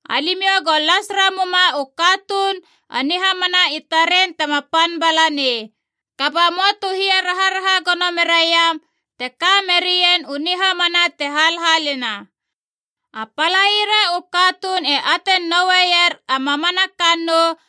Alimiou go las ramuma u katuun a nihamana i taren tema pan bala nei. Kaba möa tu hia raharaha gono meraiam te ka merien u nihamana te halhalina. A palaira u katuun e atein nouer a mamana kannou,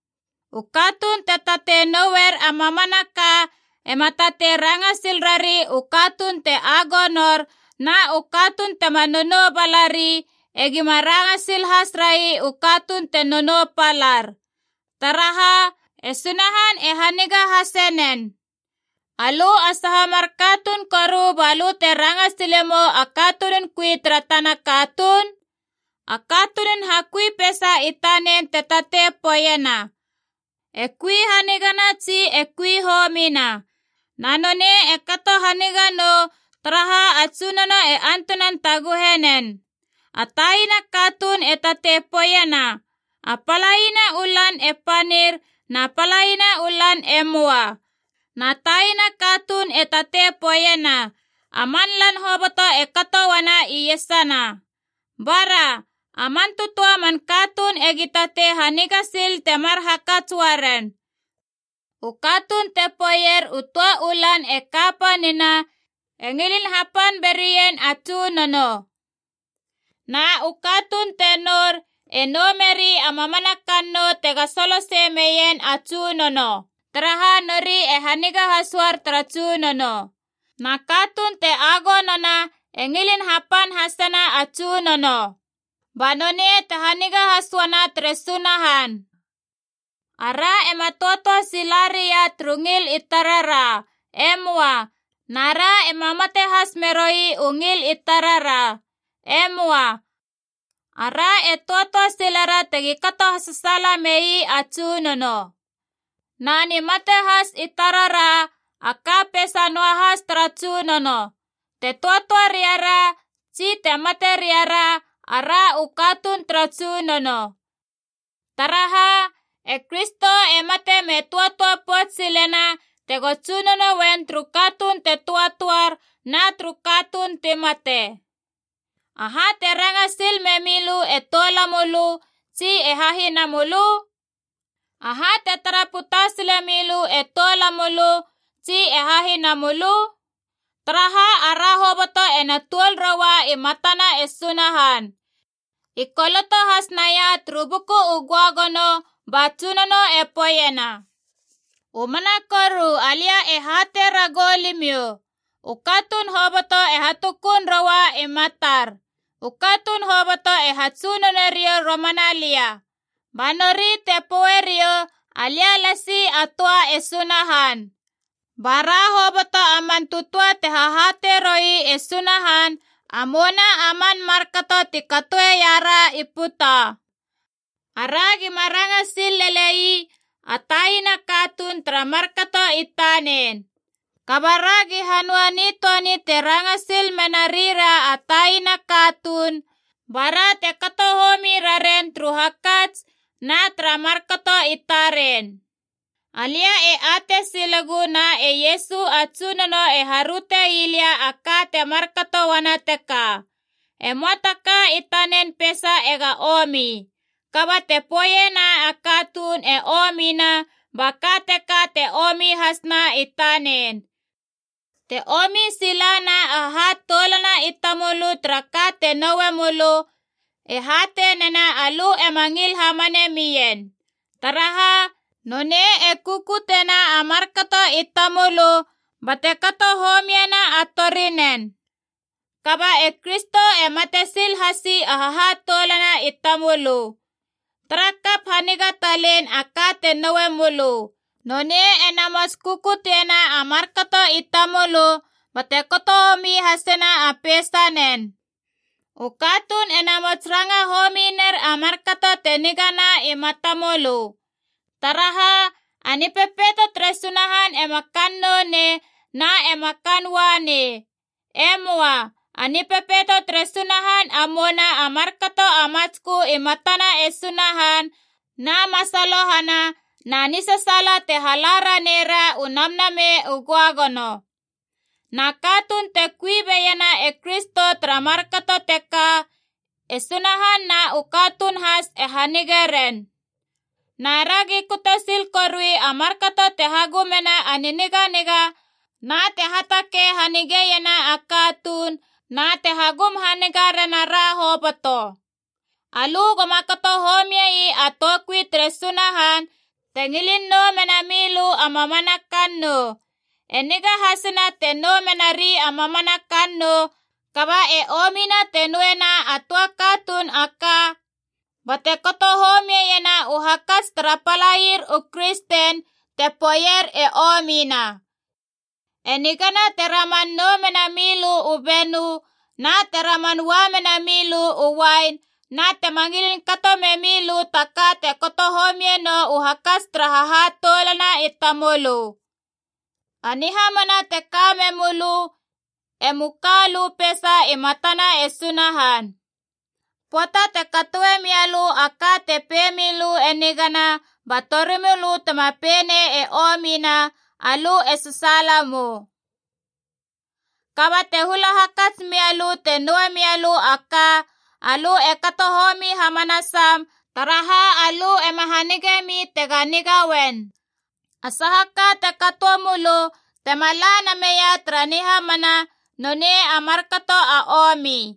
U katuun te tatei nouer a mamanaka ema tatei ranga sil rari u katuun te agonor, na u katuun tema nonou bala ri egima ranga sil has rai u katuun te nonou palar. Taraha, e Sunahan e haniga hase nen. Alö a saha mar katuun koru balö te ranga silemou a katunun kui tara tana katuun? A katunun hakui peisa i tanen te tatei poeiena, e kui hanigana tsi e kui homina. Na nonei e kato haniga nou, taraha a Tsunono e antunan taguhe nen. A taina katuun e tatei poeiena a palaina u lan e panir na palaina u lan e möa. Na taina katuun e tatei poeiena, a man lan hoboto e kato uana iesana. Bara. A man tötöa a man katuun egi atei haniga sil temar hakats uaren. U katuun te poeier u töa u lan e kapanina e ngilin hapan berien a Tsunono. Na u katuun te nour e nou meri a mamana kannou tega solosei mena neien a Tsunono, taraha nori e haniga has uar tara Tsunono. Na katuun te agonona e ngilin hapan hasena a Tsunono, ba nonei te haniga has uana tere Sunahan. Ara ema töatöa sila ria turu ngil i tarara, e möa. Na ra ema mate has meroi u ngil i tarara. E möa. Ara e töatöa silera tegi kato hasasaala mei a Tsunono. Na nimate has i tarara, a ka peisa noahas tara Tsunono. Te töatöa ria ra tsi te mate ria ra, ara u katuun tara Tsunono. Taraha, e Kristo e mate me töatöa pouts silena tego Tsunono uen turu katuun te töatöar na turu katuun ti mate. Aha te ranga sil memilö e toulamölö tsi e hahinamölö? Aha te tara puta sile milö e toulamölö tsi e hahinamölö? Taraha ara hoboto ena tuol roua i matana e Sunahan. I koloto has naia turu Buku u Göagono ba Tsunono e poeiena: “U mana koru alia e hatei ragou limiou, u katuun hoboto e hatukun roua i matar. U katuun hoboto e hatsunone riou romana lia ba nori te poe riou alia lasi a töa e Sunahan.” Ba ra hoboto a man tötöa te hahatei roi e Sunahan a mouna a man markato ti katoeia ra i puta. Ara gima ranga sil lele ii a taina katuun tara markato i tanen. Kaba ragi hanöa nitöani te ranga sil menarira a taina katuun bara te kato homi raren turu hakats na tara markato i taren. Alia e atei silegu na e Iesu a Tsunono e haröte ii lia a ka te markato uana teka, e möa ta ka i tanen peisa ega omi. Kaba te poeiena a katuun e omina ba ka teka te omi hasna i tanen. Te omi silana a hahatoulana i tamölö tara ka te noue mölö, e hatei nena alö ema ngil hamane mien. Taraha, nonei e kukutiena a markato i tamölö bate kato homiena a torinen. Kaba e Kristo e mate sil hasi a hahatoulana i tamölö. Tara kap haniga talein a ka te noue mölö. Nonei e namots kukutiena a markato i tamölö bate kato homi hasena a peisanen. U katuun e namots ranga homi ner a markato te nigana i mata mölö. Taraha, a Nipepeito tere Sunahan ema kannou nei na ema kaan ua nei. E möa. A Nipepeito tere Sunahan a mouna a markato a matskö i matana e Sunahan na masalohana na nisasaala te hala ranei ra u Namnamei u Göagono. Na katuun te kui beiena e Kristo tara markato teka, e Sunahan na u katuun has e hanige ren. Na ragi kute sil korui a markato te hagumena a niniganiga na te hatakei hanigeiena a katuun na te hagum haniga rena ra hoboto. Alö goma kato homiei a toukui tere Sunahan te ngilin nou mena milö a mamana kannou. E niga hasina te nou menari a mamana kannou, kaba e omina te nouena a katuun a töa ka bate kato homiena u hakats tara palair u kristen te poeier e omina. E nigana te raman nou mena milö u benö na te raman ua mena milö u uain na tema ngilin kato memilö ta ka te kato homie nou u hakats tara hahatoulana i tamölö. A nihamana te ka memölö emu ka lö peisa i matana e Sunahan. Pöata te katoe mia lö a ka te pei milö e nigana ba torimölö tema pei nei e omina, alö e sasaala mou. Kaba te hula hakats mia lö te noue mia lö a ka, alö e kato homi hamanasam, taraha alö ema hamanemi tega niga uen. A saha ka te katoe mölö tema la na meia tara nihamana, nonei a markato a omi.